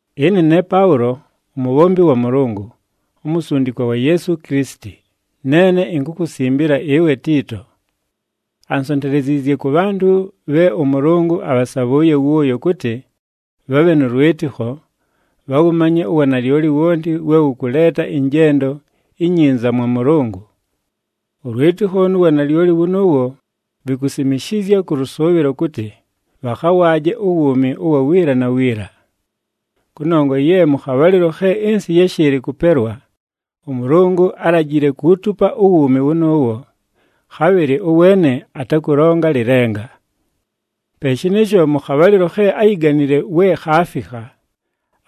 Ɨne ne Paʉlo, umubhombi wa Mʉlʉngʉ, umusundikwa wa Yeesu Kilisiti, neene inkukusimbila ɨwe Tiito. Ansonteleziizye kʉ bhantʉ bhe ʉMʉlʉngʉ abhasabhʉʉye wʉʉyo kʉtɨ, bhabhe nʉ lwɨtɨkho, bhawʉmanye uwanalyoli wonti we wʉkʉleeta ɨnjendo inyinza mwa Mʉlʉngʉ. Ʉlwɨtɨkho nu wanalyoli wʉnʉʉwo, vikusimishizya kʉ lʉsʉʉbhɨlo kʉtɨ, bhakhawaaje uwuumi ʉwa wiila na wiila. Kʉnongwa ye mʉ khabhalɨlo khe ɨnsɨ yáshɨɨlɨ kʉpelwa, ʉMʉlʉngʉ álajile kuutupa uwuumi wʉnʉʉwo, khabhɨlɨ ʉweene atakʉlonga lɨlenga. Pe shɨnɨɨsho, mʉ khabhalɨlo khe áyiganile we khaafikha,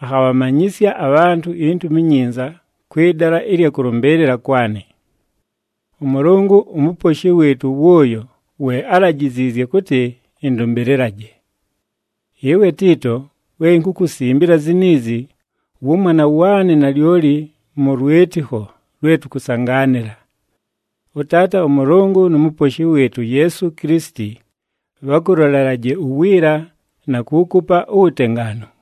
akhabhamanyɨsya abhantʉ iNtumi iNyinza kwɨ dala ɨlya kʉlʉmbɨɨlɨla kwanɨ. ɄMʉlʉngʉ uMuposhi wɨɨtʉ wʉʉyo we álajiziizye kʉtɨ ɨndʉmbɨlɨlaje. Ɨwe Tiito, we inkukusimbila ziniizi, wʉmwana waanɨ nalyoli mʉ lwɨtɨkho lwe tʉkʉsangaanɨla. ɄTaata ʉMʉlʉngʉ nu Muposhi wɨɨtʉ uYeesu Kilisiti bhakʉlolelaje uwiila, na kuukupa uwutengaanu.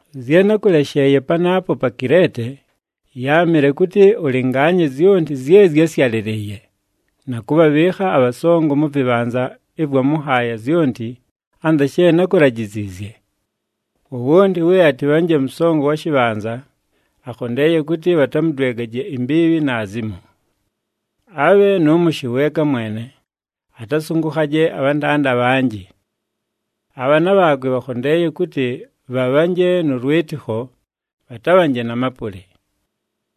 Zye nákʉlesheeye panaapo pa Kileete, yáamɨle kʉtɨ ʉlɨngaanye zyonti zye zyásyalɨlɨɨye, na kʉbhabhɨɨkha abhasongo mʉ vɨbhanza ɨvwa mʉ nhaaya zyonti, anza she nákulajiziizye. Wowonti we atɨbhanje mʉsongo wa shɨbhanza, akhondeeye kʉtɨ bhatamʉdwegaje imbiibhi naazimo. Abhe nʉ mʉshɨ weeka mwene, atasʉngʉkhaje abhantanda abhanjɨ. Abhaana bhaakwe bhakhondeeye kʉtɨ bhabhanje nʉ lwɨtɨkho, bhatabhanje na mapʉlɨ.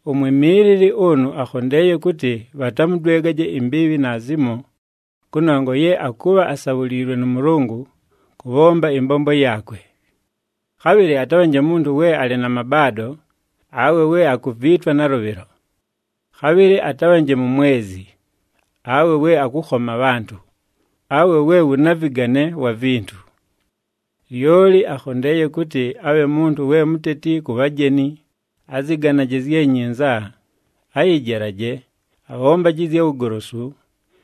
Umwimiilili ʉnʉ akhondeeye kʉtɨ bhatamʉdwegaje imbiibhi naazimo, kʉnongwa ye akʉbha asabhuliilwe nʉ Mʉlʉngʉ kʉbhomba ɨmbombo yaakwe. Khabhɨlɨ atabhanje muntu we alɨ na mabaado, awe we akuviitwa nalʉbhɨlo. Khabhɨlɨ atabhanje mumwezi, awe we akʉkhoma abhantʉ, awe we wʉ navɨgane wa vintu. Lyoli akhondeeye kʉtɨ abhe muntu we muteti ku bhajeni, azɨganaje zye nyinza, ayɨjelaje, abhombaje ɨzya wugolosu,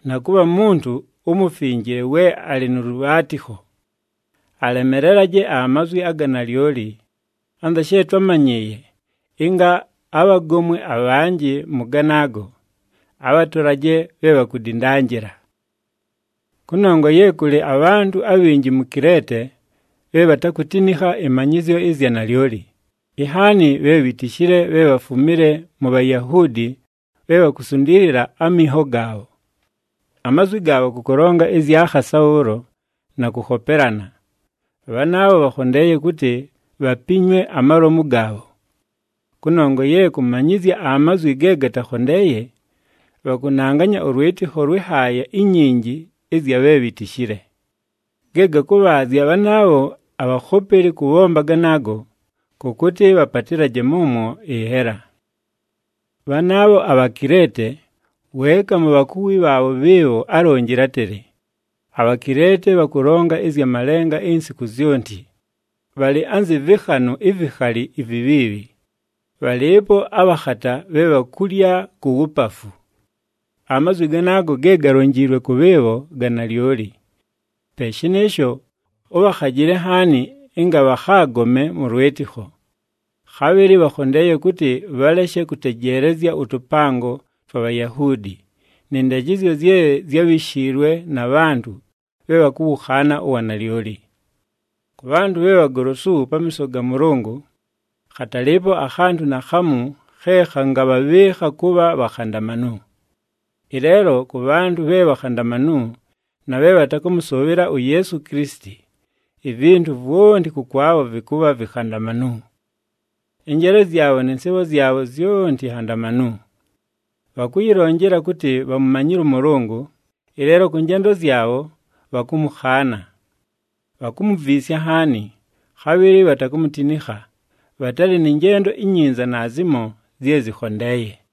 na kʉbha muntu umufinjile we alɨ nʉ lʉbhaatɨkho. Alemelelaje amazwi aga nalyoli, anza she twámanyɨɨye, ɨnga abhagomwe abhanjɨ mʉ ganaago, abhatolaje bhe bhakudindanjila. Kʉnongwa ye kʉlɨ abhantʉ abhinji mu Kileete bhe bhatakutinikha ɨmanyɨzyo ɨzya nalyoli, inhaani bhe bhitishile bhe bhafumile mu Bhayahuudi bhe bhakusundiilila aminho gaabho. Amazwi gaabho kʉ kʉlonga ɨzya khasa bhʉʉlo na kʉkhopelana. Bhanaabho bhakhondeeye kʉtɨ, bhapinywe amalomu gaabho. Kʉnongwa ye kʉmanyɨzya amazwi ge gatakhondeeye, bhakʉnanganya ʉlwɨtɨkho lwɨ nhaaya inyinji ɨzya bhe bhitishile. Ge gakʉbhaazya bhanaabho abhakhopeli kʉbhomba ganaago, kʉ kʉtɨ bhapatɨlaje mʉmwo ɨnhela! Bhanaabho aBhakileete, weeka mu bhakuwi bhaabho bhɨɨbho álonjile átɨlɨ, “ABhakileete bhakʉlonga ɨzya malenga insiku zyonti, bhalɨ anzɨ vɨkhanʉ ivikhali ivibhiibhi, bhalɨɨpo abhakhata bhe bhakulya ku wupafu.” Amazwi ganaago ge galonjiilwe kʉ bhɨɨbho ga nalyoli. Pe shɨnɨɨsho, ʉbhakhajɨle nhaani ɨnga bhakhaagome mʉ lwɨtɨkho. Khabhɨlɨ bhakhondeeye kʉtɨ bhaleshe kʉtejeelezya ʉtʉpango twa Bhayahuudi, nɨ ndajɨzyo zye zyábhishiilwe na bhantʉ bhe bhakʉwʉkhaana uwanalyoli. Kʉ bhantʉ bhe bhagolosu pamiiso ga Mʉlʉngʉ, khatalɨɨpo akhantʉ naakhamu khe khangabhabhɨɨkha kʉbha bhakhandamanu. Ɨleelo, kʉ bhantʉ bhe bhakhandamanu, na bhe bhatakʉmʉsʉʉbhɨla uYeesu Kilisiti, ivintu vwonti kʉkwabho vɨkʉbha vikhandamanu. Ɨnjeele zyabho nɨ nsɨɨbho zyabho zyonti nhandamanu. Bhakʉyɨlonjela kʉtɨ bhamumanyile ʉMʉlʉngʉ, ɨleelo kʉ njendo zyabho, bhakʉmʉkhaana. Bhakumuviisya nhaani, khabhɨlɨ bhatakumutinikha, bhatalɨ nɨ njendo inyinza naazimo zye zɨkhondeeye.